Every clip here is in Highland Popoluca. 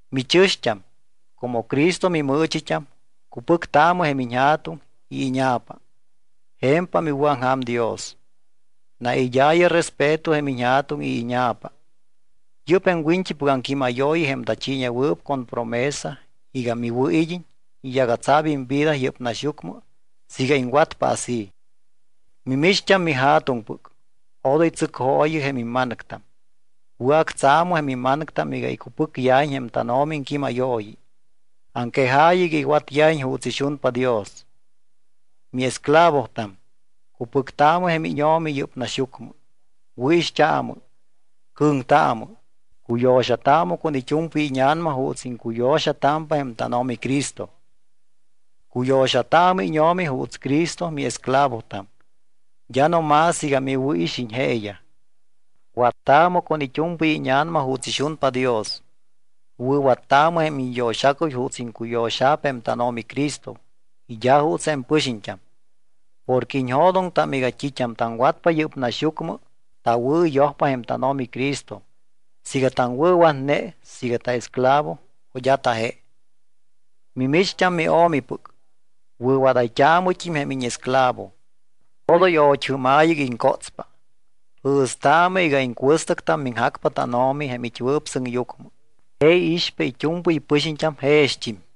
Michɨ̱xt́am, como Cristo mimɨɨchit́am, cupɨctaamɨ jém iñja̱tuŋ y íña̱pa. Je̱mpam iwɨ̱aŋja̱m Dios. Naid́aayɨ respeto jém iñja̱tuŋ y íña̱pa. Yɨ́p jém wiñt́ipɨc aŋquímayooyi jém tachiiñewɨɨp con promesa iga miwɨ̱id́iñ y yagatsa̱p imvida yɨ́p naxyucmɨ siiga iŋwatpa así. Mimicht́am mija̱tuŋpɨc, odoy tsɨcjooyɨ jém imma̱nɨctam. Wɨ̱actsa̱mɨ jém imma̱nɨctam iga icupɨcyajiñ jém tánO̱mi iŋquímayooyi. Aŋquejaayɨ iga iwatyajiñ juuts ixunpa Dios. Miesclavotam, cupɨctaamɨ jém íño̱mi yɨ́p naxyucmɨ. Wɨ̱ixt́aamɨ, cɨ̱ŋtaamɨ, cuyo̱xataamɨ con it́u̱mpɨy íña̱nama juuts iŋcuyo̱xatámpa jém tánO̱mi Cristo. Cuyo̱xataamɨ íño̱mi juuts Cristo miesclavotam, d́a no más iga miwɨ̱ixiñ jeeyaj. Wattaamɨ con it́u̱mpɨy íña̱nama juuts ixunpa Dios. Wɨ̱wattaamɨ jém iñyo̱xacuy juuts iŋcuyo̱xa̱p jém tánO̱mi Cristo y d́a juuts jém pɨxiñt́am. Porque iñjo̱doŋtam iga t́it́am taŋwatpa yɨ́p naxyucmɨ tawɨ̱yojpa jém tánO̱mi Cristo siiga taŋwɨ̱watne siiga taesclavo o d́a taje. Mimicht́am mio̱mipɨc, wɨ̱wadayt́aamɨt́im jém íñesclavo. Odoy ot́jɨ́maayɨ iga iŋcótspa. Jɨ̱staamɨ iga iŋcuɨstɨctam miŋjacpa tánO̱mi jém it́wɨɨp sɨŋyucmɨ. Je iixpa it́u̱mpɨy pɨxiñt́am jext́im.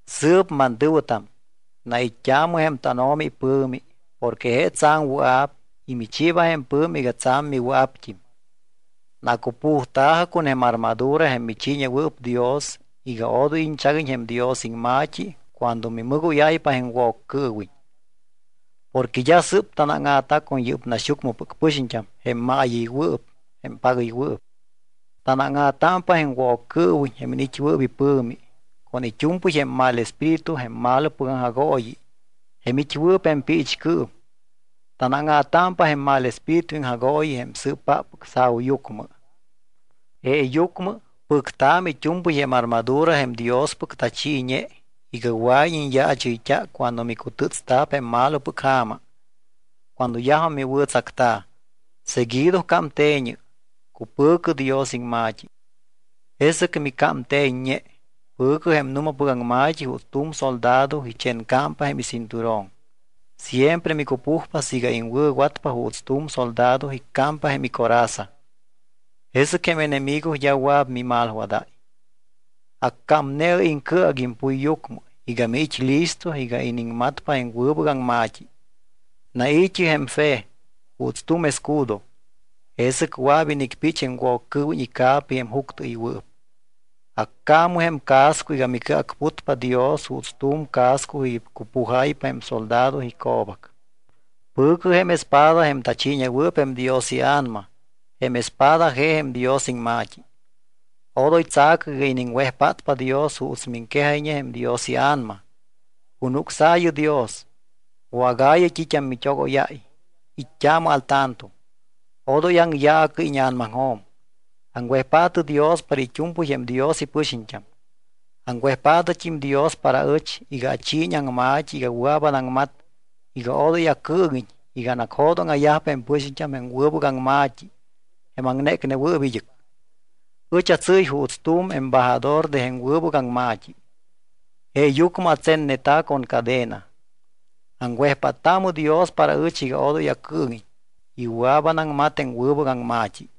Sɨɨp, mantɨ̱wɨtam, nait́t́aamɨ jém tánO̱mi ipɨ̱mi porque je tsa̱m wɨa̱p y michiiba jém pɨ̱mi iga tsa̱m miwɨa̱pt́im. Nacupujta̱jɨ con jém armadura jém michiiñewɨɨp Dios iga odoy iñchaguiñ jém Dios iŋma̱t́i cuando mimɨgóyáypa jém Woccɨɨwiñ. Porque d́a sɨ́p tanáŋa̱ta con yɨ́p naxyucmɨpɨc pɨxiñt́am jém maayɨywɨɨp jém pagɨywɨɨp. Tanáŋa̱támpa jém Woccɨɨwiñ jém iniit́wɨɨp ipɨ̱mi con it́u̱mpɨy jém mal espíritu jém malopɨc aŋjagooyi jém it́wɨɨp jém piichcɨɨm. Tanáŋa̱támpa jém mal espíritu iŋjagooyiyaj jém sɨɨpáppɨc sa̱uyucmɨ. Jeeyucmɨ pɨctaamɨ it́u̱mpɨy jém armadura jém Diospɨc tachiiñe iga wɨa̱iñ iñyaachɨyt́a cuando micutɨ́tsta̱p jém malopɨc ja̱ma. Cuando yajum miwɨ̱tsacta, seguido cámte̱ñɨ, cupɨ̱cɨ Dios iŋma̱t́i. Jesɨc micámte̱ññe. Pɨ̱cɨ jém nu̱mapɨc aŋma̱t́i juuts tu̱m soldado ichencámpa jém icinturón. Siempre micupujpa siiga iŋwɨ̱watpa juuts tu̱m soldado iccámpa jém icoraza. Jesɨc jém enemigo d́a wɨa̱p mimalwadáy. Accámne̱ɨ iŋcɨac impuyyucmɨ iga miit́ listo iga iniŋmatpa jém wɨbɨc aŋma̱t́i. Nai̱t́ɨ jém fe juuts tu̱m escudo, jesɨc wɨa̱p inicpich jém Woccɨɨwiñ ica̱pi jém juctɨɨywɨɨp. Accaamɨ jém casco iga micɨacputpa Dios juuts tu̱m casco icupujáypa jém soldado ico̱bac. Pɨ̱cɨ jém espada jém tachiiñewɨɨp jém Dios iA̱nama. Jém espada je jém Dios iŋma̱t́i. Odoy tsa̱cɨ iga iniŋwejpátpa Dios juuts miŋquejáy jém Dios iA̱nama. Cunucsaayɨ Dios, wágaayɨ t́it́am mit́ogóyáy. It́t́aamɨ al tanto, odoy aŋyaacɨ íña̱namaŋjo̱m. Aŋwejpaatɨ Dios para it́u̱mpɨy jém Dios ipɨxiñt́am. Aŋwejpaatɨt́im Dios para aɨch iga achiiñ aŋma̱t́i iga wɨa̱p anaŋmat iga odoy acɨɨŋiñ iga anacjo̱dóŋa̱yajpa jém pɨxiñt́am jém wɨbɨc aŋma̱t́i jém aŋnécnewɨɨp id́ɨc. Ɨch atsɨ́y juuts tu̱m embajador de jém wɨbɨc aŋma̱t́i. Jeeyucmɨ atsenneta̱ con cadena. Aŋwejpáttaamɨ Dios para ɨch iga odoy acɨɨŋiñ y wɨa̱p anaŋmat jém wɨbɨc aŋma̱t́i.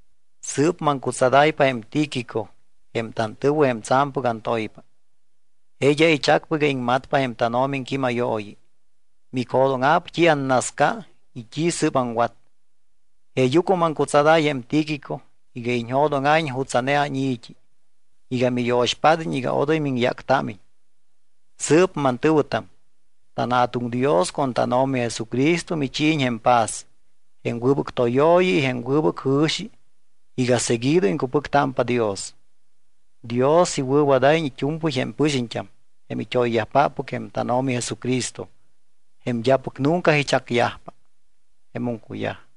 Sɨɨp maŋcutsadáypa jém Tíquico, jém tantɨ̱wɨ jém tsa̱mpɨc antoypa. Je d́a ichacpa iga iŋmatpa jém tánO̱mi iŋquímayooyi. Micjo̱dóŋa̱p t́i annasca y t́i sɨ́p aŋwat. Jeeyucmɨ maŋcutsadáy jém Tíquico iga iñjo̱dóŋa̱iñ jutsa̱ne áni̱t́i, iga miyo̱xpád́iñ iga odoy miŋyáctámiñ. Sɨɨp mantɨ̱wɨtam, tanJa̱tuŋ Dios con tánO̱mi Jesucristo michiiñ jém paz, jém wɨbɨc tóyooyi y jém wɨbɨc jɨ̱xi iga seguido iŋcupɨctámpa Dios. Dios iwɨ̱wadáyiñ it́u̱mpɨy jém pɨxiñt́am jém it́oyyajpáppɨc jém tánO̱mi Jesucristo jém d́apɨc nunca ichacyajpa. Jemum cuyaj.